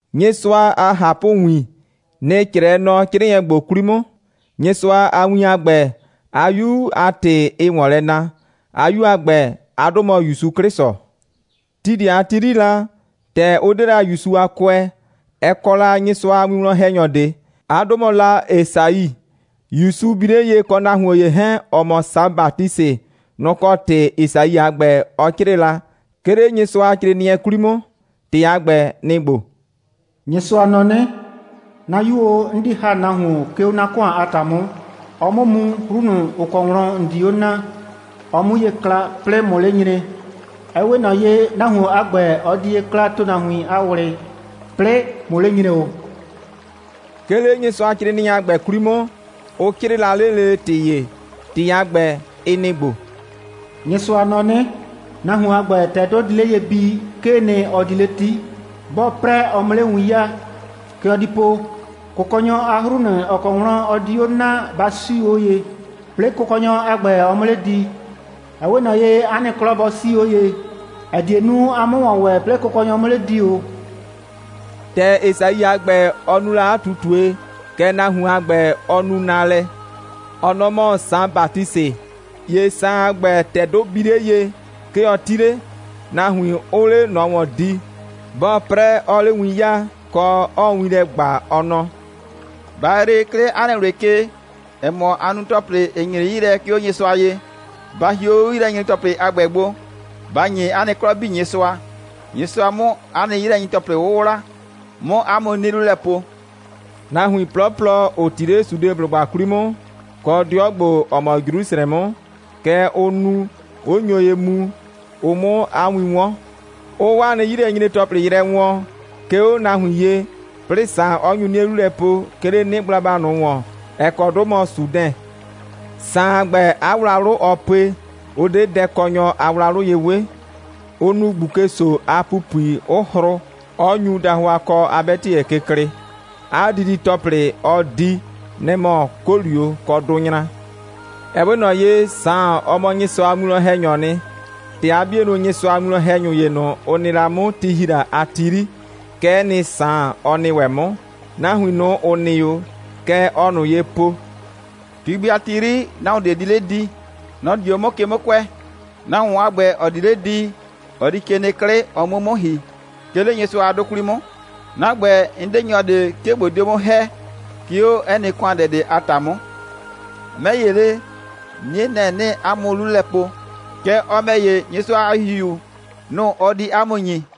Nyɩsʋa a ꞊hapʋwin, nɩ‑ 'crɛɛ nɔ 'crɩɩnɩɛ ‑gbo 'kwli 'mʋ. Nyɩsʋa a win a ‑gbɛ, 'a 'Yu a ‑tɩ, ɩɩ ‑wɔn lɛ na. 'A 'Yu a ‑gbɛ a 'dʋ mɔ ‑Yusu 'Klɩsʋ. Ti ꞊de a ti 'yri la, (‑tɛ ʋ 'de la ‑Yusu a kʋɛ,) ɛ kɔ la Nyɩsʋa a winwlɔn‑hɛnyɔ ꞊de. 'A 'dʋ mɔ la Esai. ‑Yusu bi 'le ye, kɔ nahuon ‑ye 'hɛɛn, ‑ɔ mɔ Saan Batisɩ, nʋ‑ kɔ ‑tɩ Esai a ‑gbɛ, ɔ 'crɩɩ la, 'ke 'le Nyɩsʋacrɩɩnɩɛ 'kwli 'mʋ. ‑Tɩ a ‑gbɛ, nɩ‑ ‑gbo: «Nyɩsʋa nɔ 'nɩ: 'Na 'Yu o, 'n di ‑ha nahuon, 'ke 'o 'na ‑kʋan a ‑ta 'mʋ, ɔ 'mʋ mu, 'hru ꞊nʋ, ‑ʋ kɔ wlɔn ‑n di 'o na, ɔ 'mu ye kla, 'plɩɩ ꞊mʋ 'le nyre. Ɛ 'we ꞊nɔ ye, nahuon a ‑gbɛ, ɔ di ye kla ‑tʋnahuin a ꞊wlɩ, 'plɩɩ ꞊mʋ 'le nyre ‑o.» 'Ke 'le Nyɩsʋacrɩɩnɩɛ a ‑gbɛ 'kwli 'mʋ, ʋ 'crɩɩ la lele ‑tɩ ‑ye. ‑Tɩ a ‑gbɛ, ɩ nɩ‑ ‑gbo: «Nyɩsʋa nɔ 'nɩ: Nahuon a ‑gbɛ, ‑tɛ 'dʋ di 'le ye bii, 'kee nɩ, ɔ di 'le 'ti. 'Bɔɔ 'prɛ, ɔ 'mʋ 'le win 'yaa. Kɛ ɔ di po: Kʋkɔnyɔ a 'hru ꞊nʋ, ‑ʋ kɔ wlɔn ɔ di 'o na, ba 'siu 'o ye, 'plɩɩ Kʋkɔnyɔ a ‑gbɛ, ɔ 'mʋ 'le di. Ɛ 'we ꞊nɔ ye, 'a nɩ 'klɔ bɔ 'sii 'o ye, ‑ɛ die nu, a 'mʋ ‑wɔn ‑wɛ, 'plɩɩ Kʋkɔnyɔ 'mʋ 'le di ‑o.» ‑Tɛ Esai a ‑gbɛ, ɔ nu la 'a ꞊tutue, kɛ nahuon a ‑gbɛ, ɔ nu naalɛ. Ɔ nɔ‑ mɔ Saan Batisɩ. ‑Ye Saan a ‑gbɛ, ‑tɛ 'dʋ bii 'le ye, 'ke ɔ 'ti 'le, nahuin 'ʋʋ 'le ꞊nɔ ‑wɔn di. 'Bɔɔ 'prɛ, 'ɔɔ 'le win 'yaa, kɔ, 'ɔɔ win lɛ ‑gba, ɔ nɔ: «Ba yree, 'ke 'le 'a nɩ ꞊wlɩ ke, ‑ɛ mɔ, aa nu ‑tɔplɩ, ‑ɩ nyre 'yi lɛ, 'ke 'o Nyɩsʋa ye. Ba hie 'o 'yilɛnyre‑tɔplɩ a ‑gbɛ gbo, ba ‑nye 'a nɩ 'klɔ 'bii Nyɩsʋa, Nyɩsʋa 'mʋ 'a nɩ 'yilɛnyre‑tɔplɩ 'wʋwla, 'mʋ 'a mʋ 'nie 'lu lɛ po.» Nahuin 'plɔplɔ, ‑ʋ 'ti 'le Sudeblʋgba 'kwli 'mʋ, kɔ 'dɩɔ ‑gbo, ‑ɔ mɔ Jrusrɛ 'mʋ, kɛ ʋʋ nu, 'ʋ nyo ye mu, ʋ 'mʋ 'a win 'wɔn, 'ʋʋ 'waa nɩ 'yilɛnyre‑tɔplɩ yrɛ wɔɔn, 'ke 'o nahuin ye, 'plɩɩ Saan, 'ɔ nyu 'nie 'lu lɛ po, 'ke 'le 'nɩgblaba ꞊nʋ ‑wɔn, ‑ɛ kɔ 'dʋ mɔ Sudɛn. Saan a ‑gbɛ, 'a wlawlʋ, ɔɔ pue, ʋ 'de dɛkɔnyɔ a wlawlʋ ye 'we. Ʋ nu ꞊gbuke‑so a ‑pupui, 'ʋ hrʋ, 'ɔ nyu dahʋakɔ a 'bɛtɩyɛ ke klɩɩ. 'A didi‑tɔplɩ, ɔɔ di, nɩ‑ mɔ 'kolio kɔ dʋnyra. (Ɛ 'we ꞊nɔ ye, Saan, ɔ mɔ Nyɩsʋa a winwlɔn‑hɛnyɔɔ nɩ. ‑Tɛ 'a 'bienʋ Nyɩsʋa a winwlɔn‑hɛnyʋ ‑ye ꞊nʋ, ʋ nɩ la 'mʋ, ti ‑hi la a ti 'yri, kɛ'ɛ nɩ, Saan, ɔ nɩ ‑wɛ 'mʋ.) Nahuin ꞊nʋ, ‑ʋ nɩ 'o, kɛ ɔɔ ꞊nʋ ye po: «Ti gbi a ti 'yri, nahuon ꞊de di 'le di. Nɔ‑ di 'o 'mʋ ke 'mʋ kʋɛ. Nahuon a ‑gbɛ, ‑ɔ di 'le di, ɔ di ke nɩ 'klɩ, ɔ 'mʋ 'o 'mʋ 'mʋ ‑hi, 'ke 'le Nyɩsʋa a 'dʋ 'kwli 'mʋ. 'Na ‑gbɛ, 'n 'de nyɔ ꞊de, 'ke ꞊bo dio 'mʋ ‑hɛ, 'ke 'o 'ɛ nɩ ‑kʋandɛ ꞊de a ‑ta 'mʋ. 'Mɛ ‑ye le, 'nie, nɛ‑ 'nɩɩ 'a mʋ 'lu lɛ po, kɛɛ, ɔ ‑mɛ ‑ye, Nyɩsʋa a ‑Hihiu, nʋ‑ ɔ di 'a mʋ ‑nyi.»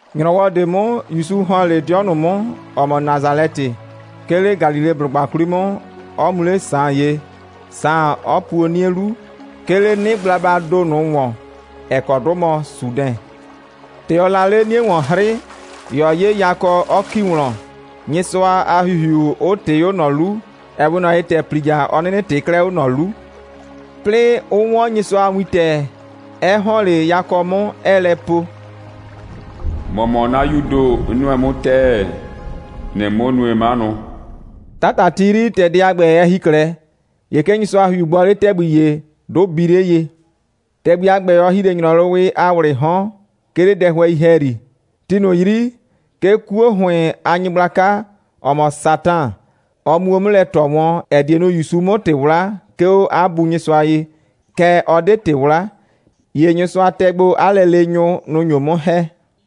‑Nyrɔwɔ ꞊de 'mʋ, ‑Yusu ‑hɔn 'le 'dɩɔ ꞊nʋ 'mʋ, ‑ɔ mɔ Nasalɛtɩ, 'ke 'le Galileblʋgba 'kwli 'mʋ, 'ɔ mu 'le Saan ye, Saan 'ɔ puo 'nie 'lu, 'ke 'le 'nɩgblabaa ‑do ꞊nʋ ‑wɔn, ‑ɛ kɔ 'dʋ mɔ Sudɛn. ‑Tɛ ɔɔ la 'le 'nie ‑wɔn 'hrɩ, ‑ye ɔ 'ye yakɔ, 'ɔ ‑ki wlɔn, Nyɩsʋa a ‑Hihiu 'ʋ ꞊tɩɩ 'o ꞊nɔ 'lu, ɛ 'we ꞊nɔ ye, ‑tɛ ‑plija, ɔ 'nɩnɩ ꞊tɩɩ 'klɛɛ 'o ꞊nɔ 'lu, 'plɩɩ 'ʋ 'wɔn Nyɩsʋa a wintɛ, 'ɛ ‑hɔn 'le yakɔ 'mʋ, 'ɛɛ lɛ po: «‑Mɔ mɔ 'na 'Yuu ‑do, 'n nʋɛ 'mʋ ‑tɛɛ. ‑Nɩɩ 'mʋ nue 'manʋ.» 'Tata a ti 'yri, ‑tɛ dɛ a ‑gbɛ, ɛ ‑hi 'klɛɛ, ‑ye 'ke Nyɩsʋa a ‑Hihiu gbɔ 'le ‑tɛgbi ‑ye, 'dʋ bii 'le ye. ‑Tɛgbi a ‑gbɛ, ɔ ‑hi 'le ‑nyrɔwɩ a ‑wlɩɩ 'hɔn, 'ke 'le dɛhʋɛi ‑hɛyri. Ti ꞊nʋ 'yri, 'ke 'kuo ‑hʋɩn a nyɩgblaka, ‑ɔ mɔ Satan, ɔ muo 'mʋ lɛ ꞊tɔ wɔn, ‑ɛ die nu, ‑Yusu 'mʋ ‑tɩ 'wla, 'ke 'o 'a Bu Nyɩsʋa ye, kɛɛ, ɔ 'de ‑tɩ 'wla. ‑Ye Nyɩsʋa tɛ gbo 'a lɛleenyʋ. Nʋ‑ nyo 'mʋ ‑hɛ.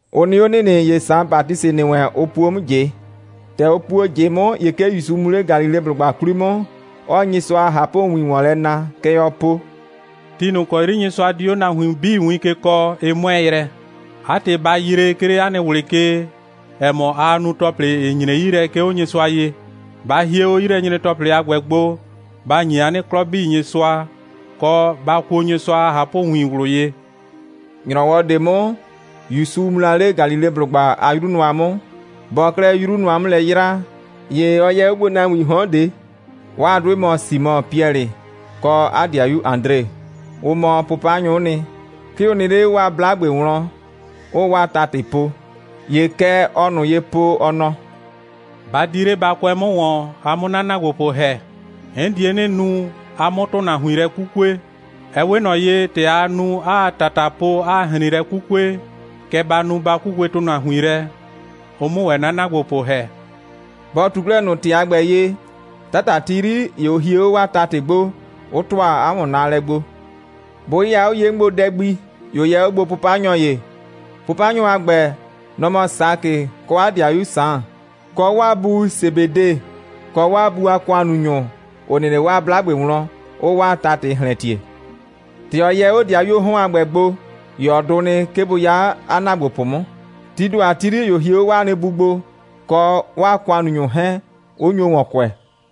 Ʋ nɩ 'o ‑nɩnɩ, ‑ye Saan Batisɩ ‑nɩ wɛn, ʋ puo 'mʋ ꞊jɩ. ‑Tɛ ʋ puo ꞊jɩ 'mʋ, ‑ye 'ke ‑Yusu mu 'le Galileblʋgba 'kwli 'mʋ, 'ɔɔ Nyɩsʋa a ꞊hapʋwin ‑wɔn lɛ na. Kɛ ɔɔ po: «Ti ꞊nʋ ‑kɔ 'yri Nyɩsʋa di 'o nahuin 'bii win ke kɔɔ, ɩ 'mʋɛɛ yrɛ. 'A ‑tɩ, ba yree, 'ke 'le 'a nɩ ꞊wlɩ ke, ‑ɛ mɔ, aa nu ‑tɔplɩ, ‑ɩ nyre 'yi lɛ, 'ke 'o Nyɩsʋa ye. Ba hie 'o 'yilɛnyre‑tɔplɩ a ‑gbɛ gbo, ba ‑nyi 'a nɩ 'klɔ 'bii Nyɩsʋa, kɔ, ba kuo Nyɩsʋa a ꞊hapʋwin ꞊wlʋ ye.» ‑Nyrɔwɔɔ ꞊de 'mʋ, ‑Yusu mu 'le Galileblʋgba a 'yru nʋa 'mʋ. Bɔɔ 'klɛɛ 'yru nʋa 'mʋ lɛ 'yraa, ‑ye ɔ yɛ 'o gbo nahuiin 'hɔn ꞊de. 'Waa 'dʋɩ mɔ Simɔ (Piɛlɩ) kɔ 'a ‑dɩayu Adre. Ʋ mɔ 'pʋpanyʋ'ʋ nɩ. 'Ke ʋ nɩ 'le 'waa 'blagbe wlɔn, 'ʋʋ 'waa ‑tatɩ po. ‑Ye kɛ ɔɔ ꞊nʋ ye po, ɔ nɔ: «Ba di 'le, ba kʋɛ 'mʋ ‑wɔn, a 'mʋ 'na ‑naagbopʋ ‑hɛ. 'N die 'nɩ nu, a 'mʋ ‑tʋnahuin lɛ 'kukue. Ɛ 'we ꞊nɔ ye, ‑tɛ aa nu, 'aa ‑tata po, 'aa ‑hrin lɛ 'kukue, kɛ ba nu, ba 'kukue ‑tʋnahuin lɛ, ʋ 'mʋ ‑wɛ 'na ‑naagbopʋ ‑hɛ.» Bɔ ꞊tu 'klɛɛ ꞊nʋ ‑tɩ a ‑gbɛ ye, 'tata a ti 'yri, ‑ye ʋ hie 'o 'waa ‑tatɩ gbo, 'ʋ ‑tʋa 'a ‑wɔnnaalɛ gbo. Bʋ 'yɩya 'o ye 'mʋ gbo dɛ gbi, ‑ye ɔ yɛ 'o gbo 'pʋpanyʋ ‑ye. 'Pʋpanyʋ a ‑gbɛ, nʋ‑ mɔ Sakɩ kɔ 'a ‑dɩayu Saan, kɔ 'waa bu Sebede, kɔ 'waa bu a ‑kʋannunyʋ, 'ʋ nɩ 'le 'waa 'blagbe wlɔn, 'ʋʋ 'waa ‑tatɩ ‑hlɛntie. ‑Tɛ ɔ yɛ 'o ‑dɩayuoo 'hɔn a ‑gbɛ gbo, ‑ye ɔ dʋ nɩ, 'ke bʋ 'ya 'a ‑naagbopʋ 'mʋ. Tii ‑do a ti 'yri, ‑ye ʋ hie 'o 'waa bu gbo, kɔ 'a ‑kʋannunyʋ 'hɛɛn, 'ʋ nyo ‑wɔn kʋɛ.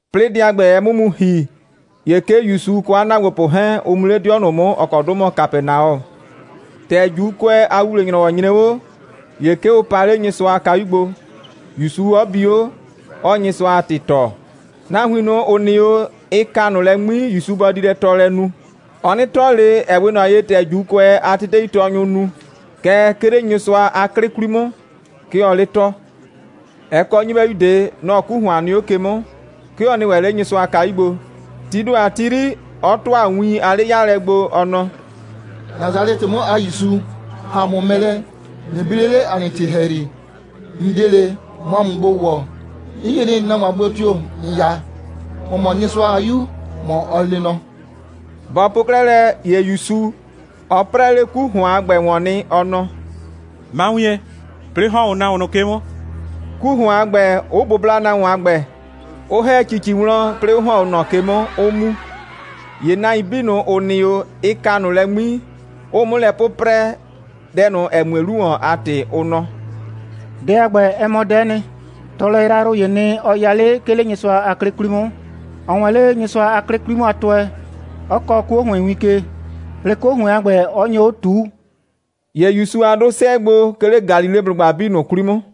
'Plɩɩ dɛ a ‑gbɛ, ɛ 'mʋ mu ‑hi, ‑ye 'ke ‑Yusu kɔ 'a ‑naagbopʋ 'hɛɛn, ʋ mu 'le 'dɩɔ ꞊nʋ 'mʋ, ‑ɔ kɔ 'dʋ mɔ Kapɛnaɔ. ‑Tɛ ‑Juukʋɛ a ‑wuwle‑nyrɔwɔ nyre 'o, ‑ye 'ke ʋ pa 'le Nyɩsʋa a kayu gbo, ‑Yusu 'ɔ bi 'o, 'ɔɔ Nyɩsʋa a ‑tɩ tɔɔ. Nahuin ꞊nʋ, ‑ʋ nɩ 'o, ɩ ka ꞊nʋ lɛ 'ŋmi, ‑Yusu bɔ di lɛ tɔɔlɛ nu. Ɔ 'nɩ tɔɔ ꞊le, ‑ɛ 'we ꞊nɔ ye, ‑tɛ ‑Juukʋɛ a teteitɔɔnyʋʋ nu, kɛɛ, 'ke 'le Nyɩsʋa a 'klɩ 'kwli 'mʋ, 'ke ɔɔ 'le tɔɔ. Ɛ kɔ nyɩbɛyu ꞊de. Nɔ‑ 'ku ‑hʋan nɩ 'o ke 'mʋ. 'Ke ɔ nɩ ‑wɛ 'le Nyɩsʋa a kayu gbo. Tii ‑do a ti 'yri, 'ɔ ‑tʋa win a 'le'yaalɛ gbo, ɔ nɔ: «Nasalɛtɩ 'mʋ a ‑Yusu, ‑ha ‑a mʋ mɛ lɛ, ꞊nɩ bi 'le 'le ‑a nɩ ‑tɩ ‑hɛyri. ‑N 'de ꞊le, ꞊mʋ ‑a mʋ gbo ‑wɔ. 'N yie nɩ, nahuon a gblo tio‑ ‑n 'ya. ‑Mɔ mɔ Nyɩsʋa a 'Yu, ‑mɔ ɔ lee nɔ.» Bɔ po 'klɛɛ lɛ, ‑ye ‑Yusu, ɔ 'prɛɛ 'le 'ku ‑hʋan a ‑gbɛ ‑wɔn nɩ, ɔ nɔ: «Ma wien, 'plɩɩ ‑hɔn 'o nahuon ꞊nʋ ke 'mʋ!» 'ku ‑hʋan a ‑gbɛ, 'ʋ bʋbla nahuon a ‑gbɛ, 'ʋ ‑hɛ ‑cici wlɔn, 'plɩɩ 'ʋ ‑hɔn 'o ꞊nɔ ke 'mʋ, 'ʋ mu. ‑Ye nahuin 'bii ꞊nʋ, ‑ʋ nɩ 'o, ɩ ka ꞊nʋ lɛ 'ŋmi, 'ʋʋ 'mʋ lɛ 'pʋprɛ, dɛ ꞊nʋ, ‑ɛ mue 'lu ‑wɔn, a ‑tɩ, ʋ nɔ: «Dɛ a ‑gbɛ, ɛ mɔ dɛ'ɛ nɩ. Tɔɔlɛ yrayrʋ ‑yee nɩ, ɔ ya 'le, 'ke 'le Nyɩsʋa a 'klɩ 'kwli 'mʋ. Ɔɔ wɛn 'le Nyɩsʋa a 'klɩ 'kwli 'mʋ a tʋɛ, 'ɔ kɔɔ 'kuo ‑hʋɩn win ke, 'plɩɩ 'kuo ‑hʋɩn a ‑gbɛ, 'ɔ nyo 'o ꞊tuu.» ‑Ye ‑Yusu a 'dʋ 'sɛɛ gbo, 'ke 'le Galileblʋgba 'bii ꞊nʋ 'kwli 'mʋ.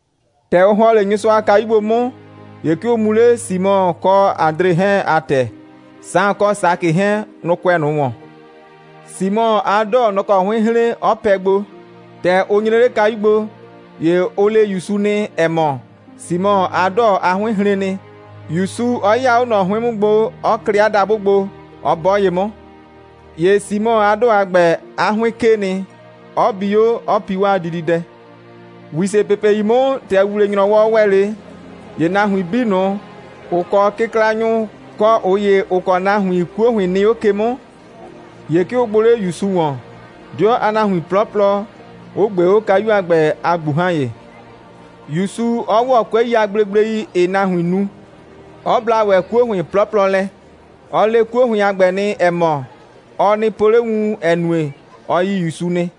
‑Tɛ ʋ ‑hɔn 'le Nyɩsʋa a kayu gbo 'mʋ, ‑ye 'ke ʋ mu 'le Simɔ kɔ Adre 'hɛɛn a ‑tɛ. Saan kɔ Sakɩ 'hɛɛn, nʋ‑ kʋɛ ꞊nʋ ‑wɔn. Simɔ a 'dɔɔ, nɔ‑ kɔ 'hʋɩn hren, 'ɔ pɛ gbo. ‑Tɛ ʋ nyre 'le kayu gbo, ‑ye ʋ le ‑Yusu nɩ, ‑ɛ mɔ, Simɔ a 'dɔɔ a 'hʋɩn hren nɩ, ‑Yusu 'ɔ 'yɩya 'o ꞊nɔ 'hʋɩn 'mʋ gbo, 'ɔ klɩ 'a dabʋ gbo, 'ɔ 'bɔ ye 'mʋ. ‑Ye Simɔ a 'dɔɔ a ‑gbɛ, 'a 'hʋɩn 'kee nɩ, 'ɔ bi 'o, 'ɔ pi 'waa dididɛ. ‑Wisepepei 'mʋ, ‑tɛ ‑wuwle‑nyrɔwɔ ‑wɛ 'le, ‑ye nahuin 'bii ꞊nʋ, ‑ʋ kɔ kɩklanyʋ, kɔ ꞊ʋ ‑ye, ‑ʋ kɔ nahuin, 'kuo ‑hʋɩn nɩ 'o ke 'mʋ, ‑ye 'ke ʋ gbʋ 'le ‑Yusu ‑wɔn, 'dɩɔ a nahuin 'plɔplɔ, 'ʋ ꞊gbee 'o kayu a ‑gbɛ a ꞊gbuhan.ye, ‑Yusu 'ɔ ‑wɔ 'kʋɛi a gblegblei, ‑ɩɩ nahuin nu, 'ɔ bla ‑wɛ 'kuo ‑hʋɩn 'plɔplɔ lɛ. Ɔ le 'kuo ‑hʋɩn a ‑gbɛ nɩ, ‑ɛ mɔ, ɔ nɩ po 'le wun, ‑ɛ nue, ɔ yi ‑Yusu nɩ.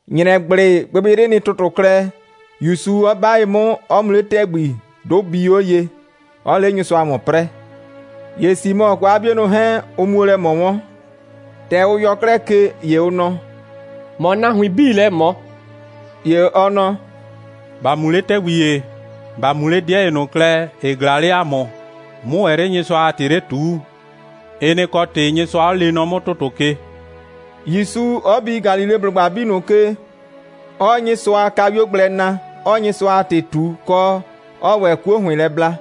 ‑Nyrɛgblɩ, gbɩgbɩyrɩ nɩ ‑tʋtʋ klɛ, ‑Yusu 'ɔ 'ba ye 'mʋ, 'ɔ mu 'le ‑tɛgbi, 'dʋ bii 'o ye, 'ɔɔ 'le Nyɩsʋa ‑wɔn 'prɛɛ. ‑Ye Simɔ kɔ 'a 'bienʋ 'hɛɛn, ʋ muo lɛ ꞊mɔ wɔn. ‑Tɛ ʋ yɔ 'klɛɛ ke, ‑ye ʋ nɔ: «‑Mɔ nahuiin 'bii lɛ ꞊mɔ.» ‑Ye ɔ nɔ: «‑Ba mu 'le ‑tɛgbi ‑ye, ‑ba mu 'le 'dɩɛ ‑ye ꞊nʋ klɛ, ‑ɩ ꞊glaa 'le ‑a mʋ, 'mʋ ‑wɛ 'le Nyɩsʋa a ‑tɩ 'le ꞊tuu. Ɩ nɩ‑ kɔ ‑tɩ Nyɩsʋa 'ɔ lee nɔ 'mʋ ‑tʋtʋ ke,» ‑Yusu 'ɔ bi Galileblʋgba 'bii ꞊nʋ ke, 'ɔɔ Nyɩsʋa a kayuo gblɛ na, 'ɔɔ Nyɩsʋa a ‑tɩ ꞊tu, kɔ, 'ɔɔ ‑wɛ 'kuo ‑hʋɩn lɛ bla.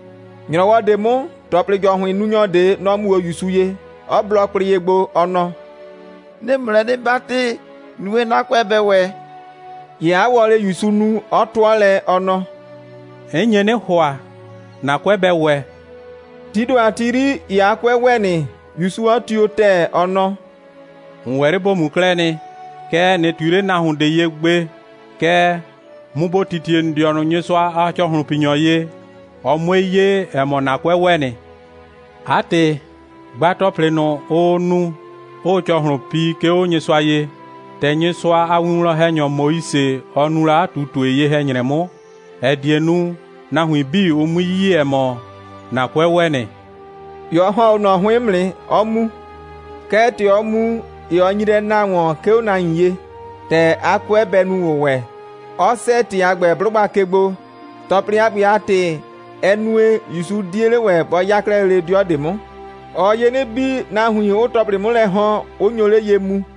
‑Nyrɔwɔ ꞊de 'mʋ, ‑tɔplɩ‑jɔhʋɩnnunyɔ ꞊de, nɔ‑ mu 'o ‑Yusu ye, 'ɔ blɔ kwlɩ ye gbo, ɔ nɔ: «'Nɩɩ ‑mʋ lɛ 'nɩ 'batɩ, nue, 'na 'kʋɛ bɛ ‑wɛ!» ‑Ye 'a wɔlɩɩ ‑Yusu nu, 'ɔ 'tʋɔ lɛ, ɔ nɔ: «'N nye 'nɩ ‑hʋa, ‑na 'kʋɛ bɛ ‑wɛ.» Tii ‑do a ti 'yri, ‑ye 'a 'kʋɛ ‑wɛ nɩ, ‑Yusu 'ɔ tio ‑tɛɛ, ɔ nɔ: «‑N ‑wɛ 'le ‑bo mu 'klɛɛ nɩ. Kɛɛ, ꞊nɩ ꞊tui 'le nahuon ꞊de ye gbe! Kɛɛ, mu ‑bo titie ‑n dɩɔnʋ Nyɩsʋa a ‑cɔhlʋnpinyɔ ye, ɔ 'mue 'ye, ‑ɛ mɔ, ‑na 'kʋɛ ‑wɛ nɩ. 'A ‑tɩ, gba ‑tɔplɩ ꞊nʋ, ʋʋ nu, 'ʋʋ ‑cɔhlʋn pi, 'ke 'o Nyɩsʋa ye, ‑tɛ Nyɩsʋa a winwlɔn‑hɛnyɔ Moise, ɔ nu la 'a ꞊tutue ye‑hɛ‑nyrɛ 'mʋ, ‑ɛ die nu, nahuin 'bii, ʋ 'mui yi, ‑ɛ mɔ, ‑na 'kʋɛ ‑wɛ nɩ!» ‑Ye ɔ ‑hɔn 'o ꞊nɔ 'hʋɩn 'mʋ nɩ, 'ɔ mu. Kɛɛ, ‑tɛ ɔ mu, ‑ye ɔ nyi lɛ na ‑wɔn, 'ke 'o nahuin ye, ‑tɛ 'a 'kʋɛ bɛ nu ‑wʋwɛ, 'ɔ 'sɛɛ ‑tɩ a ‑gbɛ 'blʋgba ke gbo. ‑Tɔplɩ a ‑gbɛ a ‑tɩ, ɛ nue, ‑Yusu 'die 'le ‑wɛ, bɔ 'ya 'klɛɛ lele 'dɩɔ ꞊de 'mʋ. Ɔɔ ye 'nɩ bii, nahuin 'ʋʋ ‑tɔplɩ 'mʋ lɛ ‑hɔn, 'ʋ nyo 'le ye mu.